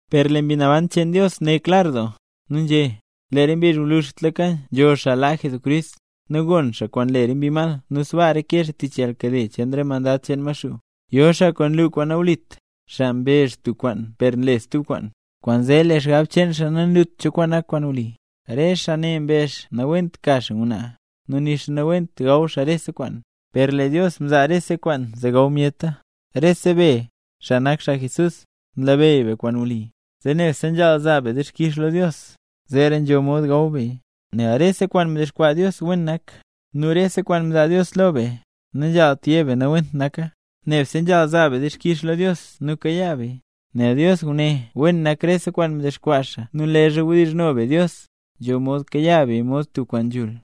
Per lee Mbi Naban cheen Dios né klar doo, nu nzhé: Lee re mbizh gwluzhtlaka nzho xaa laa Jesucrist. Nu gon xaa kwaan nlu re mbi mal nu sbaa reke xaa tich yalnkade cheen re mandad cheen Maxuu. Yo xaa kwaan nlu kwaan nawlit, xaa mbezh tub kwaan per nle xaa stub kwaan. Kwaanzee lee xgab cheen xaa nanlut cho kwaan nak kwaan wli. Re xaa ne mbezh nawent ka xaa ngwnaa, nu nixa nawent gaw xaa rese kwaan; per lee Dios mzaa rese kwaan zee gaw myeta. Rese be, xaa nak xaa Jesús, nlabeyy be kwaan wli, zee nebse nzhaal zaa be dixkix lo Dios, zeera nzho mod gaw beya. Nel rese kwaan mdexkwaa Dios wen nak, nu rese kwaan mzaa Dios lo be, nanzhaalt yé be nawent naka, nebse nzhaal zaa be dixkix lo Dios nu kayaa beya. Nel Dios ngune wen nak rese kwaan mdexkwaa xaa nu leezha wdizhno be Dios, nzho mod kayaa beya mod tub kwaan nzhul.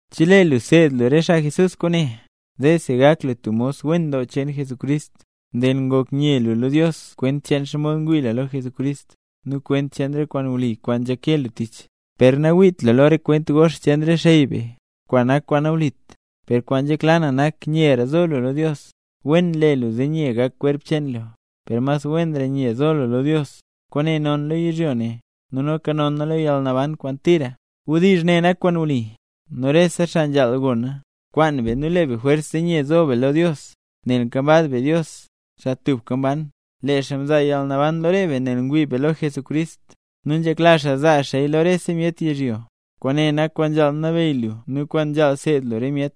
Chelee lu seed lu re xaa Jesús kwaane, zeesi gak lu tub mos wen doo cheen Jesucrist. Nel ngok nye lu lo Dios kwent cheen xomod ngwii lu lo Jesucrist nu kwent cheen re kwaan wli kwaan nzhake lu tich. Per nawiit lu lo re kwent gox cheen re xey be, kwaan nak kwaan nawlit. Per kwaan nzhekla na nak nyera zo lu lo Dios. Wen nle lu zee nye gak kwerp cheen lu, per mas wenra nye nzo lu lo Dios. Kwaane non lo yizhyo ne nu noka nona lo yalnaban kwaan tira. Wdizh ne nak kwaan wli, nu rese xaa nzhaal gona. Kwaan be nu le be jwers zee nye zo be lo Dios, nel nkambaz be Dios, xaa tubka mban. Lee xaa mzaa yalnaban lo re be, nel ngwii be lo Jesucrist, nu nzhekla xaa zaa xaaya lo rese myet yizhyo. Kwaane nak kwaan nzhaal nabeyy lu nu kwaan nzhaal seed lu re myet.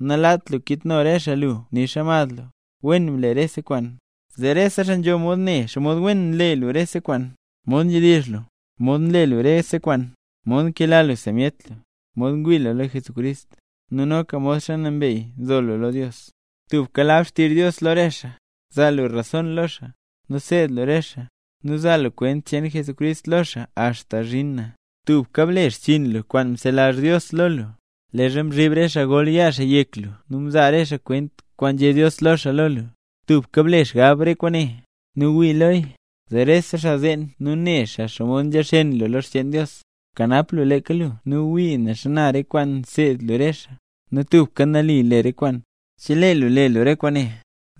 Nalaat lu kitno re xaa lu nixa mad lu. Wen ble rese kwaan, zee rese xaa nzho mod ne xomod wen nle lu rese kwaan: mod nzhedizh lu, mod nle lu rese kwaan, mod nkela lu sa myet lu, mod ngwii lu lo Jesucrist, nu noka modxa nambey nzo lu lo Dios. Tubka lab xtizh Dios lo re xaa, zaa lu rason lo xaa, nu seed lu re xaa, nu zaa lu kwent cheen Jesucrist lo xaa axta zhin na. Tubka ble xchiin lu kwaan mzelazh Dios lo lu, leezha mzhib re xaa gol yaa xaa yek lu nu mzaa re xaa kwent kwaan nzhé Dios lo xaa lo lu. Tubka ble xgab re kwaane, nu wii loya, zee rese xaa zeen nu ne xaa xomod nzha xeen lu lo xcheen Dios. Bkanap lu leeka lu nu wii ne xana re kwaan nseed lu re xaa, nu tubka nali le re kwaan. Chelee lu le lu re kwaane,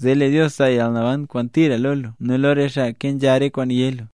zee lee Dios zaa yalnaban kwaan tira lo lu nu lo re xaa kenzha re kwaan yé lu.